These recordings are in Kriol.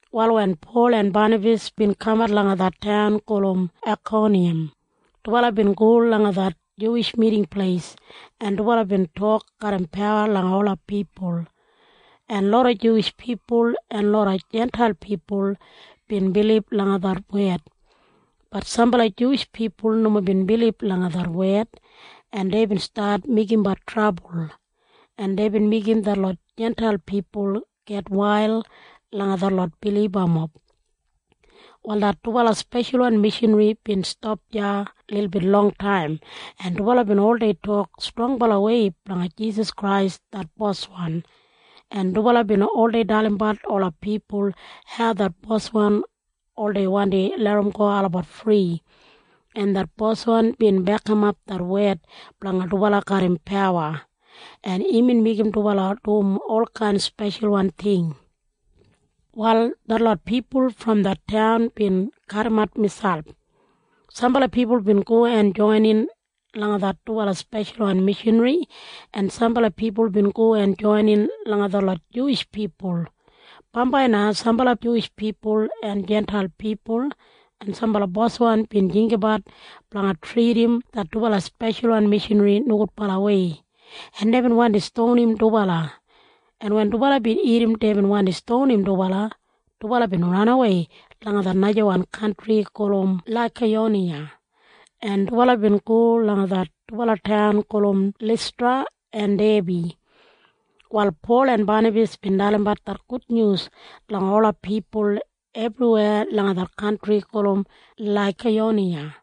Wal wen Pol en Banabas bin kamat langa det taun gulum Aikoniyam, dubala bin go langa det Juwish Miting Pleis, en dubala bin tok garram pawa langa ola pipul, en loda Juwish pipul en loda Jintail pipul bin bilib langa det wed. Bat sambala Juwish pipul nomo bin bilib langa det wed, en deibin stat meigimbat trabul, en deibin meigim detlot Jintail pipul gitwail langa detlot bilibamob. Wal det dubala speshalwan mishanri bin stap deya lilbit longtaim, en dubala bin oldei tok strongbalawei blanga Jisas Krais det Boswan, en dubala bin oldei dalimbat ola pipul hau det Boswan oldei wandi larramgo olabat fri, en det boswan bin bekimap det wed blanga dubala garram pawa, en imbin meigim dubala dum olkain speshalwan ting. Wal detlot pipul brom det taun bin kadimat miselp. Sambala pipul bin go en joinin langa det dubala speshalwan mishanri, en sambala pipul bin go en joinin langa detlot Juwish pipul. Bambai na sambala Juwish pipul en Jintail pipul en sambala boswan bin jinggabat blanga tridim det dubala speshalwan mishanri nogudbalawei, en deibin wandi stonim dubala, en wen dubala bin irrim deibin wandi stonim dubala, dubala bin ranawei langa det najawan kantri gulum Laikayoniya, en dubala bin go langa det dubala taun gulum Listra en Debi. Wal Pol en Banabas bin dalimbat det gudnyus langa ola pipul ebriweya langa det kantri gulum Laikayoniya.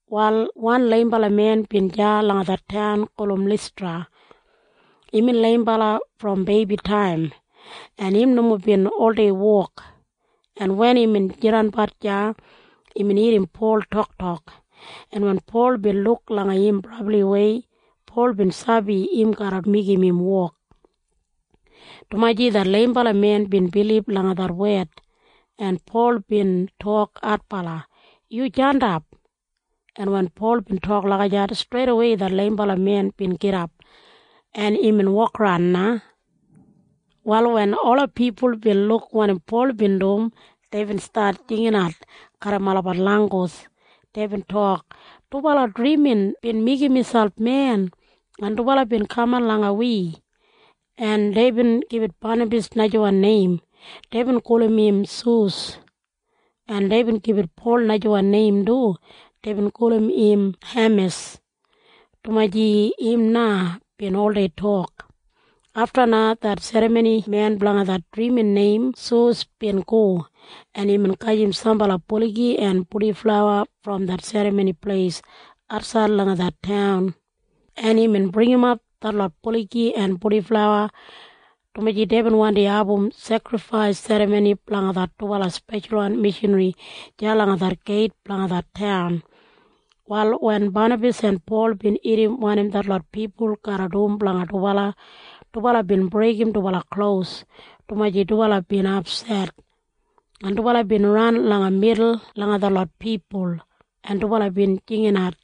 Wal wan leimbala men bin deya langa det taun gulum Listra. Imbin leimbala brom beibitaim, en im nomo bin oldei wok, en wen imbin jidanbat deya, imbin irrim Pol toktok, en wen Pol bin luk langa im brabliwei, Pol bin sabi im garra meigim im wok, dumaji det leimbala men bin bilib langa det wed, en Pol bin tok adbala, “Yu jandap.” En wen Pol bin tok lagijat, streidawei det leimbala men bin gidap, en imbin wokaran na. Wal wen ola pipul bin luk wanim Pol bin dum, deibin stat jinginat garram olabat langgus. Deibin tok, “Dubala drimin bin meigim miselp men, en dubala bin kaman langa wi.” En deibin gibit Banabas najawan neim. Deibin gulum im Sus. En deibin gibit Pol najawan neim du. Deibin gulum im Hemis, dumaji im na bin oldei tok. Afta na det serramonimen blanga det drimin neim Sus bin go, en imbin gajim sambala buligi en purdiflawa brom det serramoni pleis atsaid langa det taun, en imbin bringimap detlot buligi en purdiflawa, dumaji deibin wandi abum sekrifais serramoni blanga det dubala speshalwan mishanri deya langa det geit blanga det taun. Wal wen Banabas en Pol bin irrim wanim detlot pipul garra dum blanga dubala, dubala bin breigim dubala klos, dumaji dubala bin apset, en dubala bin ran langa midul langa detlot pipul, en dubala bin jinginat.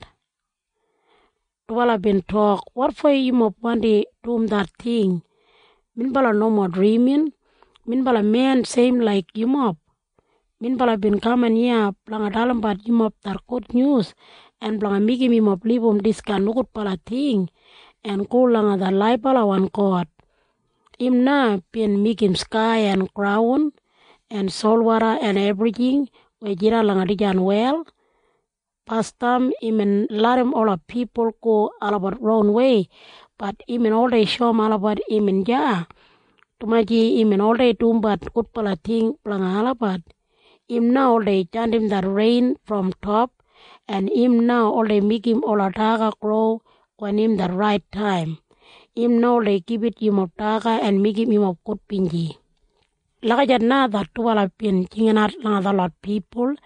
Dubala bin tok, “Wotfo yumob wandi dum det ting? Minbala nomo drimin! Minbala men seim laik yumob! Minbala bin kaman iya blanga dalimbat yumob det gudnyus en blanga meigim yumob libum diskain nogudbala ting en go langa det laibalawan God. Im na bin meigim skai en graun en solwoda en ebrijing weya jidan langa dijan wel. Basdam imbin larram ola pipul go olabat ronwei. Bat imbin oldei shoum olabat imbin deya, dumaji imbin oldei dumbat gudbala ting blanga olabat. Im na oldei jandim det rein brom top, en im na oldei meigim ola daga gro wen im det rait taim. Im na oldei gibit yumob daga en meigim yumob gudbinji.” Lagijat na det dubala bin jinginat langa detlot pipul.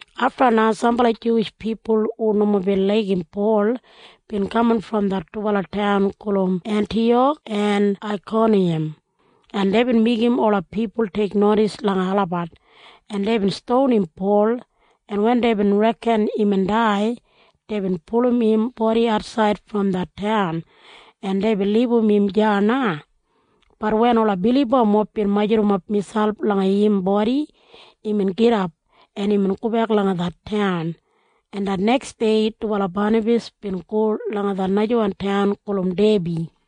Afta na sambala Juwish pipul hu nomo bin laigim Pol bin kaman brom det dubala taun gulum Entiyak en Aikoniyam, en deibin meigim ola pipul teiknodis langa olabat, en deibin stonim Pol, en wen deibin reken imbin dai, deibin pulum im bodi atsaid brom det taun, en deibin libum im deya na. Bat wen ola bilibamob bin majurrumap miselp langa im bodi, imbin gidap, en imbin gobek langa det taun, en det neksdei dubala Banabas bin go langa det najawan taun gulum Debi.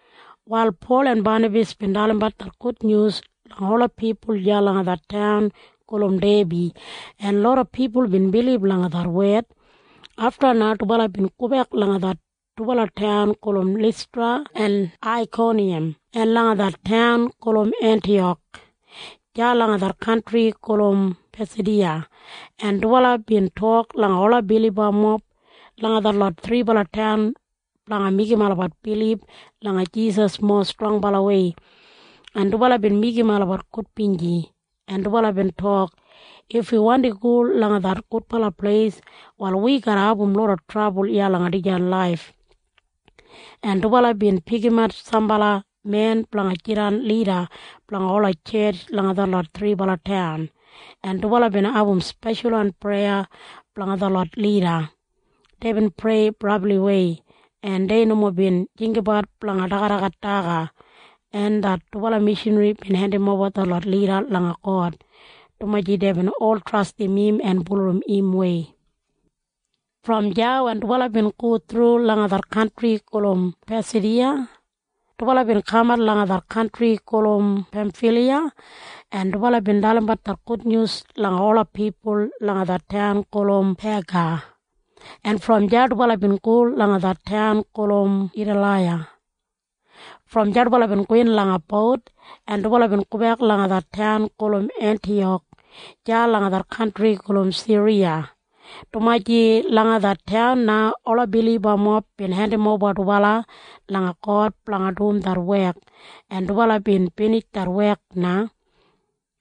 Wal Pol en Banabas bin dalimbat det gudnyus langa ola pipul deya langa det taun gulum Debi, en loda pipul bin bilib langa det wed. Afta na dubala bin gobek langa det dubala taun gulum Listra en Aikoniyam en langa det taun gulum Entiyak deya langa det kantri gulum Pasidiya. En dubala bin tok langa ola bilibamob langa detlot thribala taun blanga meigim olabat bilib langa Jisas mowa strongbalawei. En dubala bin meigim olabat gudbinji, en dubala bin tok, “If wi wandi go langa det gudbala pleis, wal wi garra abum loda trabul iya langa dijan laif.” En dubala bin pikimat sambala men blanga jidan lida blanga ola tjetj langa detlot thribala taun, en dubala bin abum speshalwan preya blanga detlot lida. Deibin prei brabliwei, en dei nomo bin jinggabat blanga dagadagat daga, en det dubala mishanri bin hendimoba detlot lida langa God, dumaji deibin ol trastim im en bulurrum imwei. Brom deya wen dubala bin go thru langa det kantri gulum Pasidiya, dubala bin kamat langa det kantri gulum Pemfiliya. En dubala bin dalimbat det gudnyus langa ola pipul langa det taun gulum Pega, en brom deya dubala bin go langa det taun gulum Etalaiya. Brom deya dubala bin gowin langa bout, en dubala bin gobek langa det taun gulum Entiyak deya langa det kantri gulum Siriya, dumaji langa det taun na ola bilibamob bin hendimoba dubala langa God blanga dum det wek, en dubala bin binij det wek na.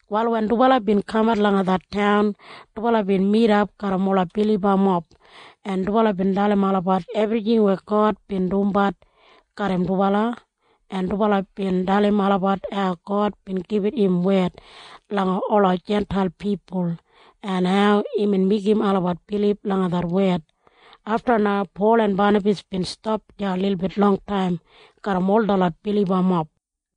Wal wen dubala bin kamat langa det taun, dubala bin midap garram ola bilibamob, en dubala bin dalim olabat ebrijing weya God bin dumbat garram dubala, en dubala bin dalim olabat hau God bin gibit im wed langa ola Jintail pipul en hau imbin meigim olabat bilib langa det wed. Afta na Pol en Banabas bin stap deya lilbit longtaim garram ol detlot bilibamob.